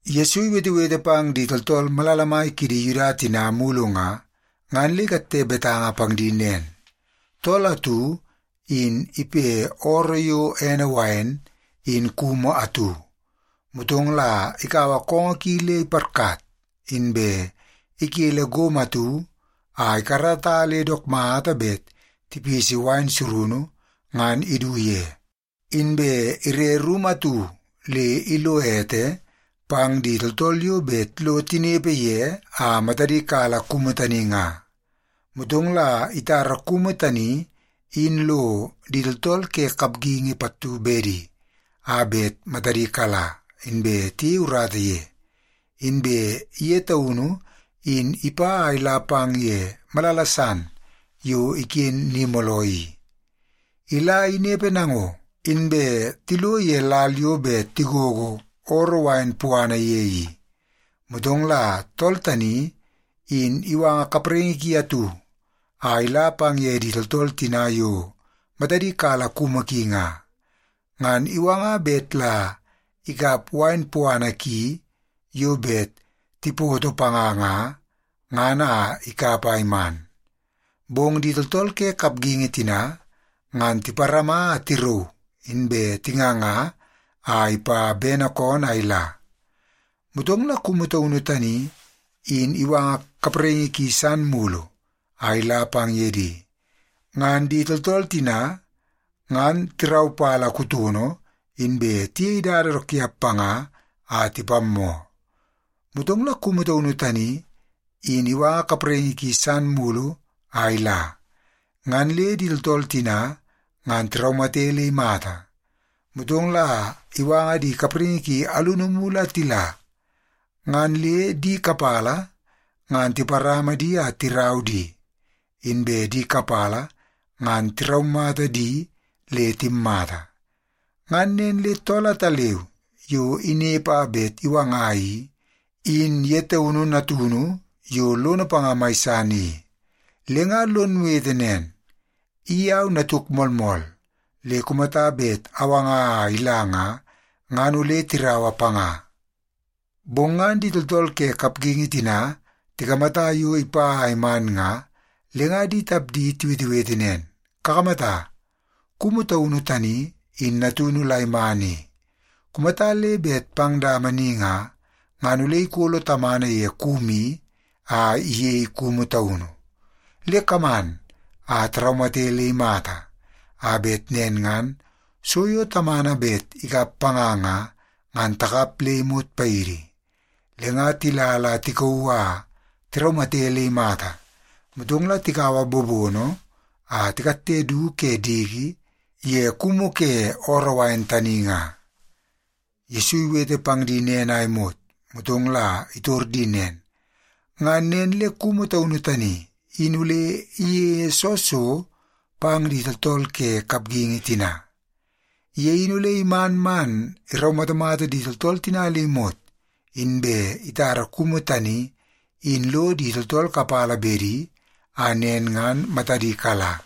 Yesu iwetewete pang di tooltool maimai kidi Yuda tina mulu nga, ngan le ikatte betanga pang di nen, “Tool atu in ipe ooroo yo ene wain in kumu atu. Motong la ikaua koongoo ki le iparkat, inbe ikele gomo atu a ikarata le dook mata bet tipisi wain surunu ngan idu ye. Inbe ire rumu atu le ilo ete pang di tooltool yo bet lo tinepe ye a matadi kala kumu tani nga. Motong la itara kumu tani in lo di tooltool ke kapgingi pattu bedi a bet matadi kala, inbe tiyei urata ye. Inbe ye taunu in ipa a ila pang ye malala san yo iken ni mooloo i. Ila inepe nango, inbe tilo ye lal yo bet tigogo ooroo wain puana ye i, motong la tool tani in iwanga kapraingi ki atu a ila pang ye di tooltool tina yo matadi kala kumu ki nga. Ngan iwanga bet la ikap wain puana ki yo bet tipoto panga nga, ngan a ikap a iman. Bong di tooltool ke kapgingi tina ngan tiparama a tirauu, inbe tinganga a ipa bene koonoo a ila. Motong la kumu taunu tani in iwanga kapraingi ki san mulu a ila pang ye di. Ngan di tooltool tina ngan tiraupala kutono, inbe tiyei dada dook tiap panga a tipammoo. Motong la kumu taunu tani in iwanga kapraingi ki san mulu a ila. Ngan le di tooltool tina ngan tiraumate le imata. Motong la iwanga di kapraingi ki alunu mulu a tila, ngan le di kapala ngan tiparama di a tirau di, inbe di kapala ngan tiraumata di le timmata. “Ngan nen le tool ataleu yo inepe a bet iwanga i, in ye taunu natunu yo lono panga mai san i. Le nga lon wete nen, ‘I au natuk moolmool, le kumata bet awanga a ila nga, ngan ole tiraua panga.’ “Bong ngan di tooltool ke kapgingi tina tikamata yo ipa a iman nga, le nga di tapdi tiwetewete nen, ‘Kakamata, kumu taunu tani in natunu la iman i. Kumata le bet pang dama ni nga, ngan ole ikolo tamana ye kumu i a iyei kumu taunu. Le kaman a taraumate le imata, a bet nen ngan so yo tamana bet ikap panga nga, ngan takap le imot paidi.’ Le nga tila tikauu a tiraumate le imata, motong la tikaua bobono a tikatte du ke diki ye kumu ke ooroo wain tani nga.” Yesu iwete pang di nen a imot, motong la itor di nen, “Ngan nen le kumu taunu tani in ole iyeie soo so pang di tooltool ke kapgingi tina? Ye in ole iman man iraumatamata di tooltool tina le imot, inbe itara kumu tani in lo di tooltool kapala bedi a nen ngan matadi kala.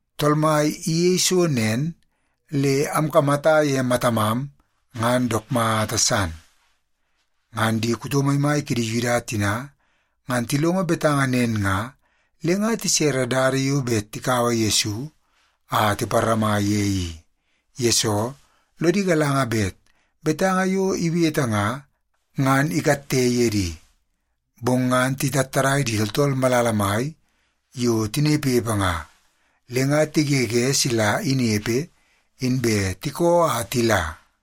Tool Mai iyeie so nen, le amkamata ye matamam, ngan dook mata san.’” Ngan di kuto maimai kidi Yuda tina ngan tilongo betanga nen nga, le nga tisere dada yo bet tikaua Yesu a tiparama ye i. Yesoo, lodi galanga bet betanga yo iwete nga, ngan ikatte ye di. Bong ngan titattadai di tooltool malala mai yo tinepepe nga, le nga tigege sila inepe, inbe tikoo a tila.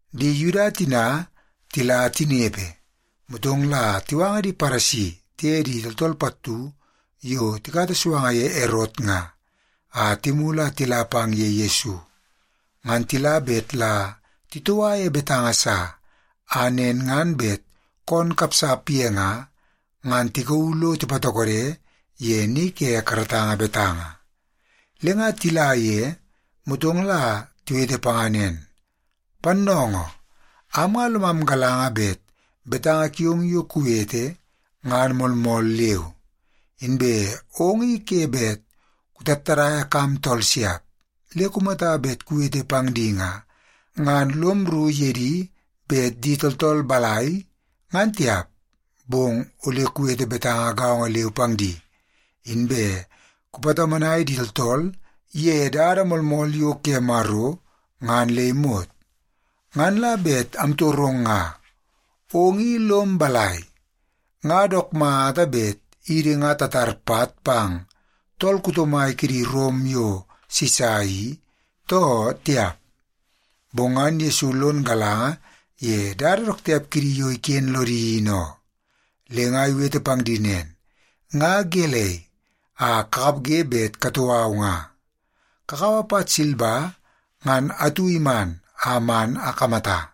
Di Yuda tina tila tinepe, motong la tiwanga di Paresi tiye di tooltool pattu yo tikata suanga ye Erot nga, a timulu a tila pang ye Yesu. Ngan tila bet la titoua ye betanga sa, a nen ngan bet koon kapsap ye nga, ngan tikauu lo tipatokode ye ni ke karatanga betanga. Le nga tila ye, motong la tiwete panga nen, “Pannoongoo, am nga lomam galanga bet betanga kiong yo kuwete ngan moolmool leu. Inbe ong i ke bet kutattadaia kam tool siap. Le kumata bet kuwete pang di nga, ngan lom rru ye di bet di tooltool balai, ngan tiap, bong ole kuwete betanga gaongo leu pang di, inbe kupatomonai di tooltool ye dada moolmool yo ke Maro ngan le imot. Ngan la bet amtorong nga, ong i lom balai? Nga dook mata bet idi nga tatar pat pang tool kuto mai kidi Rom yo Sisa i, too tiap?” Bong ngan Yesu lon galanga ye dada dook tiap kidi yo iken lodi in oo, le nga iwete pang di nen, “Nga gelei a kakapge bet katou au nga? Kakaua pat silba ngan atu iman a man akamata.”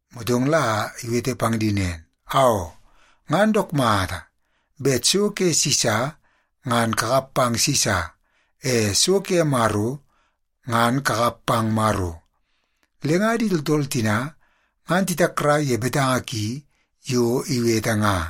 Motong la iwete pang di nen, “Aoo, ngan dook mata! Bet so ke Sisa, ngan kakap pang Sisa. E so ke Maro, ngan kakap pang Maro.” Le nga di tooltool tina ngan titakrai ye betanga ki yo iwete nga.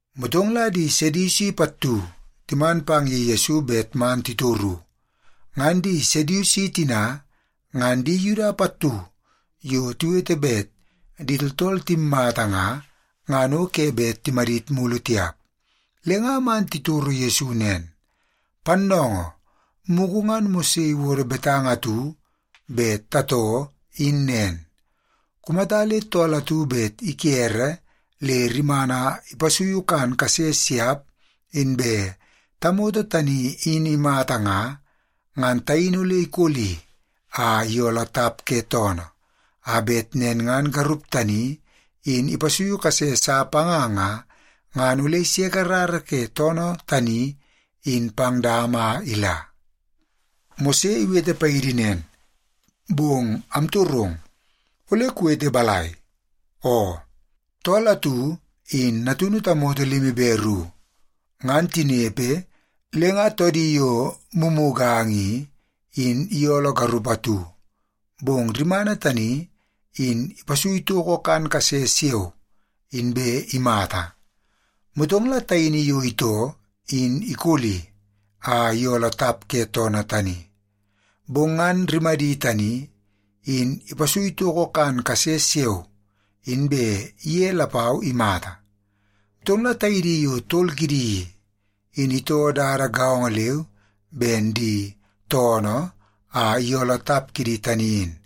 Motong la di Sedusi pattu timan pang ye Yesu bet man titoru. Ngan di Sedusi tina, ngan di Yuda pattu yo tiwete bet di tooltool timmata nga, ngan o ke bet timadit mulu tiap. Le nga man titoro Yesu nen, “Pannoongoo, mugu ngan Mose iwodo betanga atu bet tatoo in nen. Kumata le tool atu bet ikere le rimana ipasuiu kan kase siap, inbe tamoto tani in imata nga, ngan taini ole ikoli a iyooloo tap ke toonoo, a bet nen ngan garup tani in ipasui kase sa panga nga, ngan ole iseke rara ke toonoo tani in pang dama a ila. Mose iwete paidi nen, bong amtorong, ole kuwete balai? Oo, tool atu in natunu tamoto limi be ru. Ngan tinepe, le nga toodi yo mumuganga i, in iyooloo garup atu, bong rimana tani in ipasui toko kan kase siao, inbe imata. Motong la taini yo itoo in ikoli a iyooloo tap ke toonoo tani. Bong ngan rimadi tani in ipasui toko kan kase siao, inbe ye lapau imata. Motong la taidi yo tol kidi i, in itoo dada gaongo leu ben di toonoo a iyooloo tap kidi tani in.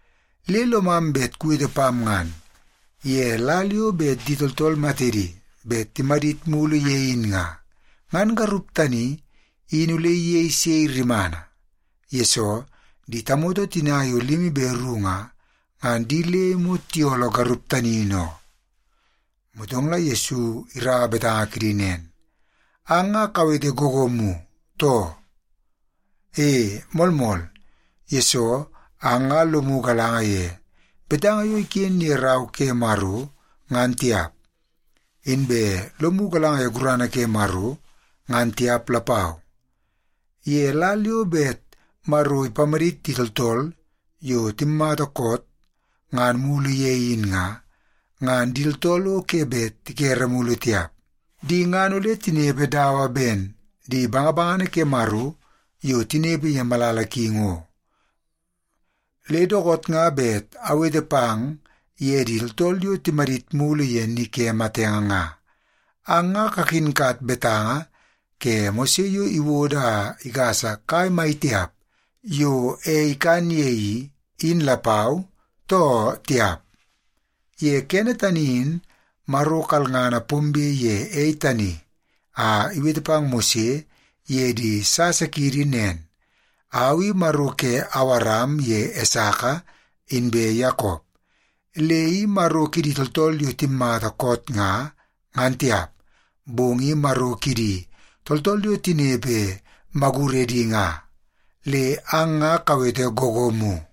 Le lomam bet kuwete pam ngan, ye lal yo bet di tooltool matedi bet timadit mulu ye in nga, ngan garup tani in ole iyei sei rimana? Yesoo, di tamoto tina yo limi be ru nga, ngan di le imot tiyooloo garup tani in oo.” Motong la Yesu iraua betanga kidi nen, “Ang nga kawete googoomu, too? E, moolmool, yesoo ang nga lomu galanga ye betanga yo iken ye Rau ke Maro, ngan tiap. Inbe lomu galanga ye gurana ke Maro, ngan tiap lapau. Ye lal yo bet Maro ipamadit di tooltool yo timmata koot ngan mulu ye in nga, ngan di tooltool o ke bet tikere mulu tiap. Di ngan ole tinepe dawa ben di bangabangana ke Maro yo tinepe ye malala ki ngo. Le dookoot nga bet awete pang ye di tooltool yo timadit mulu ye ni ke matenge nga. Ang nga kakinkat betanga ke Mose yo iwodo a igasa kai mai tiap yo ei ikan ye i, in lapau, too tiap? Ye kene tani in Maro kalngana pombe ye ei tani a iwete pang Mose ye di sasa kiidi nen, ‘Au i Maro ke Awaram ye Esaka inbe Yakop.’ Le i Maro kidi tooltool yo timmata koot nga, ngan tiap, bong i Maro kidi tooltool yo tinepe maguredi nga. Le ang nga kawete googoomu.”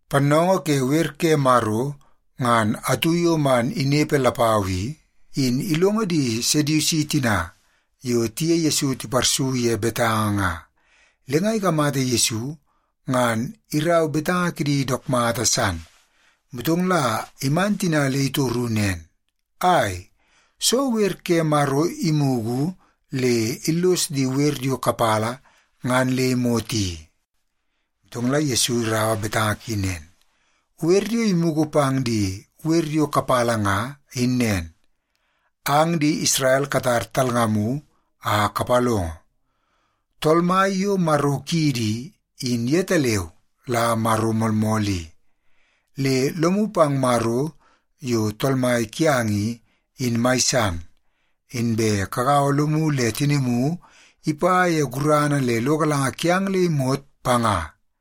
Pannoongoo ke wer ke Maro ngan atu yo man inepe lapau i, in ilongo di Sedusi tina yo tiye Yesu tiparsu ye betanga nga. Le nga ikamata Yesu ngan irau betanga kidi dook mata san. Motong la iman tina le itoru nen, “Ai, soo wer ke Maro imugu le illos di wer yo kapala ngan le imot i?” Motong la Yesu iraua betanga ki nen, “Wer yo imugu pang di wer yo kapala nga, in nen: ‘Ang di Isrel katar talngamu a kapalongo. Tool Mai yo Maro kiidi i, in yetaleu la Maro moolmool i. Le lomu pang Maro yo Tool Mai kiang i, in mai san, inbe kagaua lomu le tinimu ipa ye gurana le lo galanga kiang le imot panga.’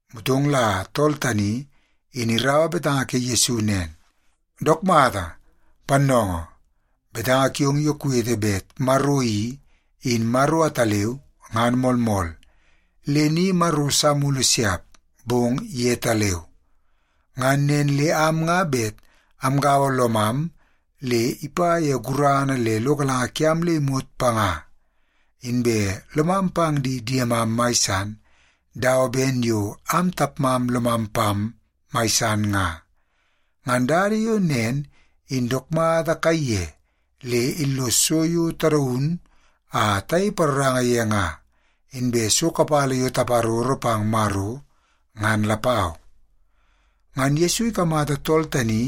Motong la tool tani in iraua betanga ke Yesu nen, “Dook mata, pannoongoo! Betanga kiong yo kuwete bet Maro i, in Maro ataleu ngan moolmool. Le ni maro sa mulu siap, bong yetaleu. Ngan nen le am nga bet amgaua lomam le ipa ye gurana le lo galanga kiam le imot panga. Inbe lomam pang di diemam mai san dawa ben yo am tapmam lomam pam mai san nga. Ngan dada yo nen in dook mata kaiye le illos so yo tadaun a tayei paroranga ye nga, inbe so kapala yo taparoro pang Maro, ngan lapau.” Ngan Yesu ikamata tool tani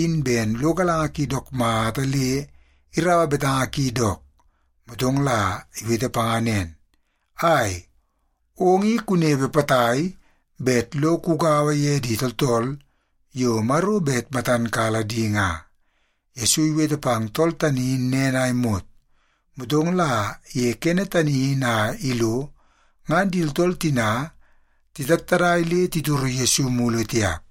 in ben lo galanga ki dook mata le iraua betanga ki dook, motong la iwete panga nen, “Ai, ong i kunepe potai bet lo kugaua ye di tooltool yo Maro bet matan kala di nga.” Yesu iwete pang tool tani in nen a imot, motong la ye kene tani in a ilo ngan di tooltool tina titattadai le titoro Yesu mulu tiap.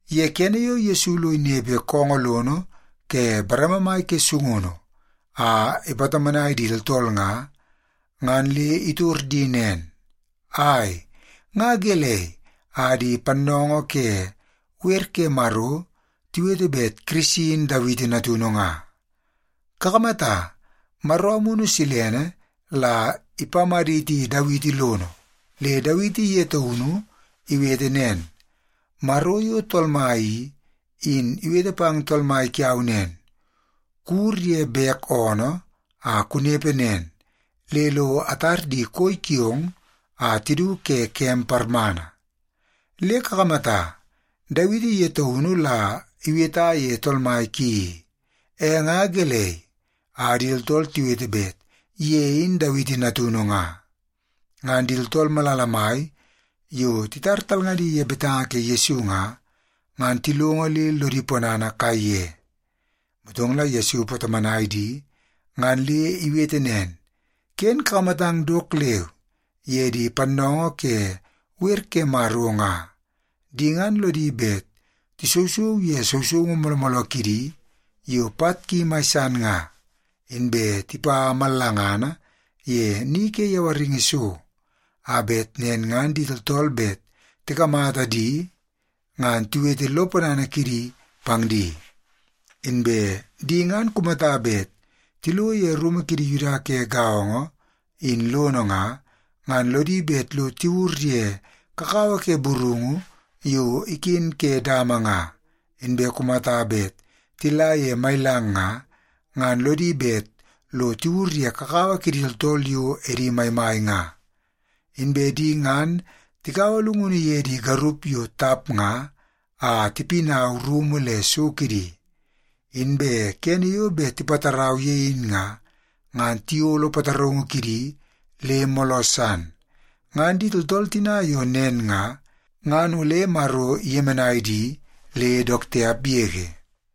Ye kene yo Yesu lo inepe koongoo lono ke bareme mai ke sungunu a ipatomonai di tooltool nga, ngan le itor di nen, “Ai, nga gelei a di pannoongoo ke wer ke Maro tiwete bet Kirisi in Dawiti natunu nga? Kakamata, Maro Amunu Silene la ipamaditi Dawiti lono, le Dawiti ye taunu iwete nen, ‘Maro yo Tool Mai i, in iwete pang Tool Mai kiau nen. “Kuwur ye bek oonoo a kunepe nen le lo atar di koi kiong a tidu ke kem parmana.” ’ Le kakamata, Dawiti ye taunu la iweta ye Tool Mai ki i. E nga gelei a di tooltool tiwete bet ye in Dawiti natunu nga?” Ngan di tooltool malala mai yo titar talngadi ye betanga ke Yesu nga, ngan tilongo le lodi ponana kaiye. Motong la Yesu ipatomonai di ngan le iwete nen, “Ken kakamatang dook leu ye di pannoongoo ke wer ke Maro nga. Di ngan lodi bet tisousou ye sousoungu mooloo mooloo kidi yo pat ki mai san nga, inbe tipa mallangana ye ni ke yawaringi so, a bet nen ngan di tooltool bet tikamata di ngan tiwete lo ponana kidi pang di. Inbe di ngan kumata bet tilo ye rumu kidi Yuda ke gaongo in lono nga, ngan lodi bet lo tiwur ye kakawa ke burungu yo iken ke dama nga, inbe kumata bet tila ye mailang nga, ngan lodi bet lo tiwur ye kakawa kidi tooltool yo edi maimai nga. Inbe di ngan tikaua llungunu ye di garup yo tap nga a tipinau rumu le so kidi. Inbe kene yo bet tipatarau ye in nga, ngan tiyolo pataraungu kidi le mooloo san. Ngan di tooltool tina yo nen nga, ngan ole Maro iyemenai di le dook tiap yege.”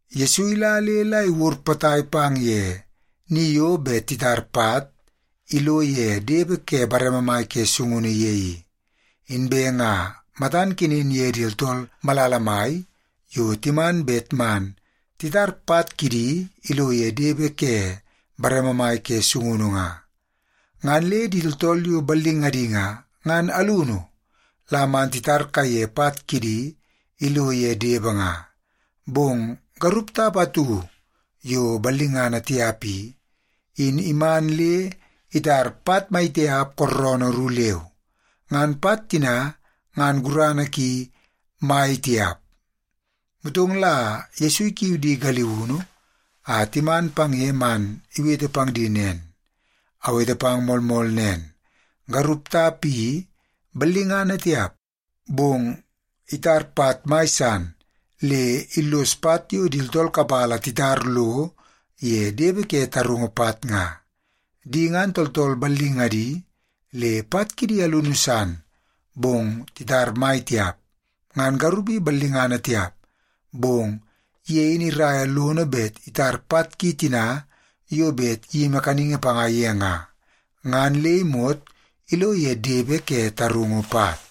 Yesu ila le la iwur potai pang ye ni yo bet titar pat ilo ye depe ke bareme mai ke sungunu ye i. Inbe nga matan kenen ye di tooltool malala mai yo timan bet man titar pat kidi ilo ye depe ke bareme mai ke sungunu nga. Ngan le di tooltool yo ballingadi nga, ngan alunu la man titar kaiye pat kidi ilo ye depe nga. Bong garup tap atu yo ballingana tiap i, in iman le itar pat maitiap kooroonoo ru leu. Ngan pat tina ngan gurana ki mai tiap. Motong la Yesu ikiu di galiunu a timan pang ye man iwete pang di nen, “Awete pang moolmool nen, garup tap i ballingana tiap, bong itar pat mai san le illos pat yo di tooltool kapala titar lo ye depe ke tarungu pat nga. Di ngan tooltool ballingadi le pat kidi alunu san, bong titar mai tiap. Ngan garup i ballingana tiap, bong ye in iraia lono bet itar pat ki tina yo bet iyimi kaningi panga ye nga, ngan le imot ilo ye depe ke tarungu pat.”